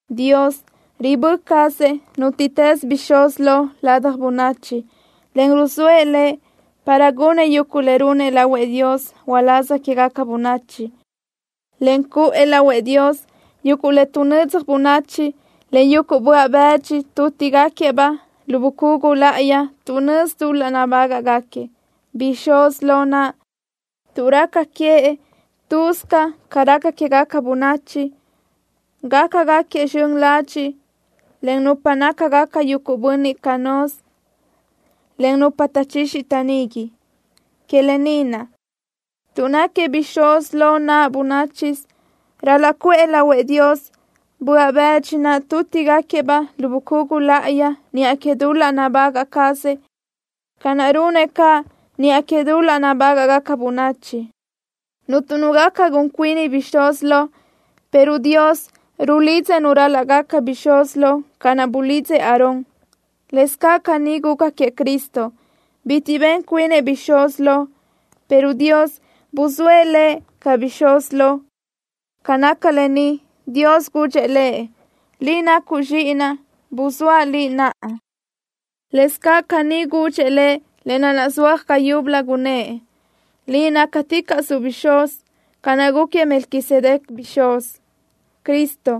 Dios ribö́ cazëʼ nútiʼtës bixúz lo ladaj bönachi, en ruzóëʼ lëʼ para gunëʼ yuguʼ le runëʼ lahuëʼ Dios uláz quégaca bönachi, en cuʼë lahuëʼ Dios yuguʼ le tuʼnödzaj bönachi, en yuguʼ böaʼ bëdxi tútigaquiëʼ-baʼ lu bucugu láʼayi tuʼ nözi dul-laʼ nabágaʼgaquiëʼ. Bixúz lo naʼ, tuʼ raca queëʼ lë́bisö ca raca quégaca bönachi, gaca gáquiëʼ zxön ladxiʼ len nupa nácagaca yuguʼ bönniʼ canö́z, en nupa taʼchixi taʼnigui. Que lë ni naʼ, tuʼ náquiëʼ bixúz lo naʼ bönáchisö, ral-laʼ cuʼë lahuëʼ Dios böaʼ bëdxi naʼ tútigaquiëʼ-baʼ lu bucugu láʼayi niʼa que dul-laʼ nabagaʼ cazëʼ, ca naʼ runëʼ caʼ niʼa que dul-laʼ nabágaʼgaca bönachi. Cuntu nu gaca gun cuini bixúz lo, pero Dios rulidzëʼ nu ral-laʼ gaca bixúz lo, ca naʼ bulidzëʼ Aarón. Lëscaʼ caní guca queëʼ Cristo. Bitiʼ ben cuinëʼ bixúz lo, pero Dios buzóëʼ Lëʼ ca bixúz lo. Ca naca lë ni, Dios gudxëʼ Lëʼ: Liʼ nacuʼ Zxíʼinaʼ. Buzóaʼ Liʼ naʼa. Lëscaʼ caní gudxëʼ Lëʼ le nazúaj ga yúbölö, gunnë́ʼ: Liʼ nácaticaʼsuʼ bixúz, ca naʼ gúquiëʼ Melquisedec bixúz. Cristo,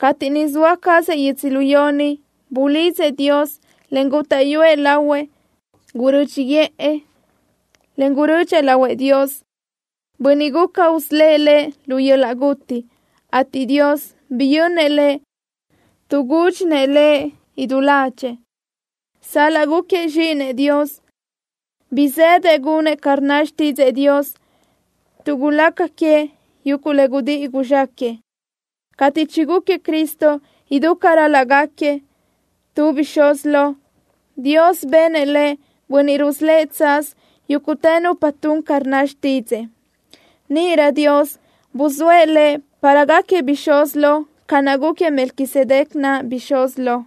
cateʼ niʼ zoa cazëʼ yödzölió ni, bulidzëʼ Dios, en gútaʼyuëʼ lahuëʼ. Gurö́dxiʼë, en gurödxëʼ lahuëʼ Dios, Bönniʼ guca usölë́ʼ Lëʼ lu yöl-laʼ guti, ateʼ Dios biyönnëʼ Lëʼ tuʼ gúdxinëʼ Lëʼ idú ládxëʼë. Sal-laʼ gúquiëʼ Zxíʼinëʼ Dios, bizë́dëʼ gunëʼ ca rnna xtídzëʼë Dios tuʼ gulaca queëʼ yuguʼ le gudíʼi guzxáquëʼë. Cateʼ chigúquiëʼ Cristo idú ca ral-laʼ gáquiëʼ tu bixúz lo, Dios benëʼ Lëʼ Bönniʼ rusölë́ʼ tsaz yúguʼtë nupa tun ca rnna xtídzëʼë. Níʼirö Dios buzóëʼ Lëʼ para gáquiëʼ bixúz lo ca naʼ gúquiëʼ Melquisedec naʼ bixúz lo.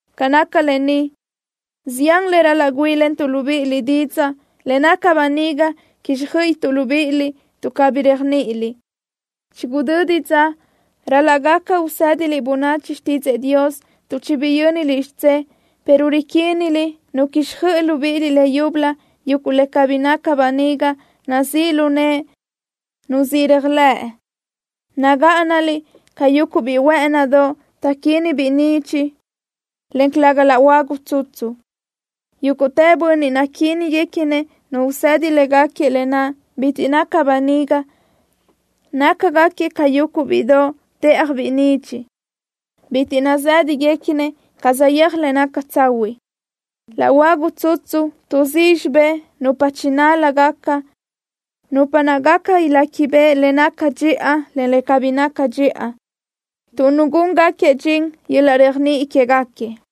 Ca naca lë ni, zián le ral-laʼ güíʼilentuʼ libíʼiliʼ didzaʼ, le naca böniga quíxjöiʼituʼ libíʼiliʼ, tuʼ cabí réajniʼiniliʼ. Chigudödi dza ral-laʼ gaca usédiliʼ bönachi xtídzëʼë Dios, tuʼ chibiyö́niliʼ xidzé, pero riquíniliʼ nu quíxjöiʼi libíʼiliʼ leyúbölö yuguʼ le cabí naca böniga nazíʼ lu nëʼe nu siʼ réajlëʼ. Nagáʼanaliʼ ca yuguʼ biʼi huë́ʼënidoʼ taʼquínibiʼ nidxiʼ, en calëga laʼ huagu tsutsu. Yúguʼtë bönniʼ naquíniguequinëʼ nu usedi légaquiëʼ lë naʼ bitiʼ naca böniga, nácagaquiëʼ ca yuguʼ bíʼidoʼ téʼajbiʼ nidxiʼ. Bitiʼ nazë́dagaquiëʼ ca saʼyéaj le naca tsahuiʼ. Laʼ huagu tsutsu tuʼzíʼ xibé nupa chinál-lágaca, nupa naʼ gaca iléquibeʼe le naca dxiʼa, en le cabí naca dxiʼa, tuʼ nugúngaquiëʼ dxin yöl-laʼ réajniʼi quégaquiëʼ.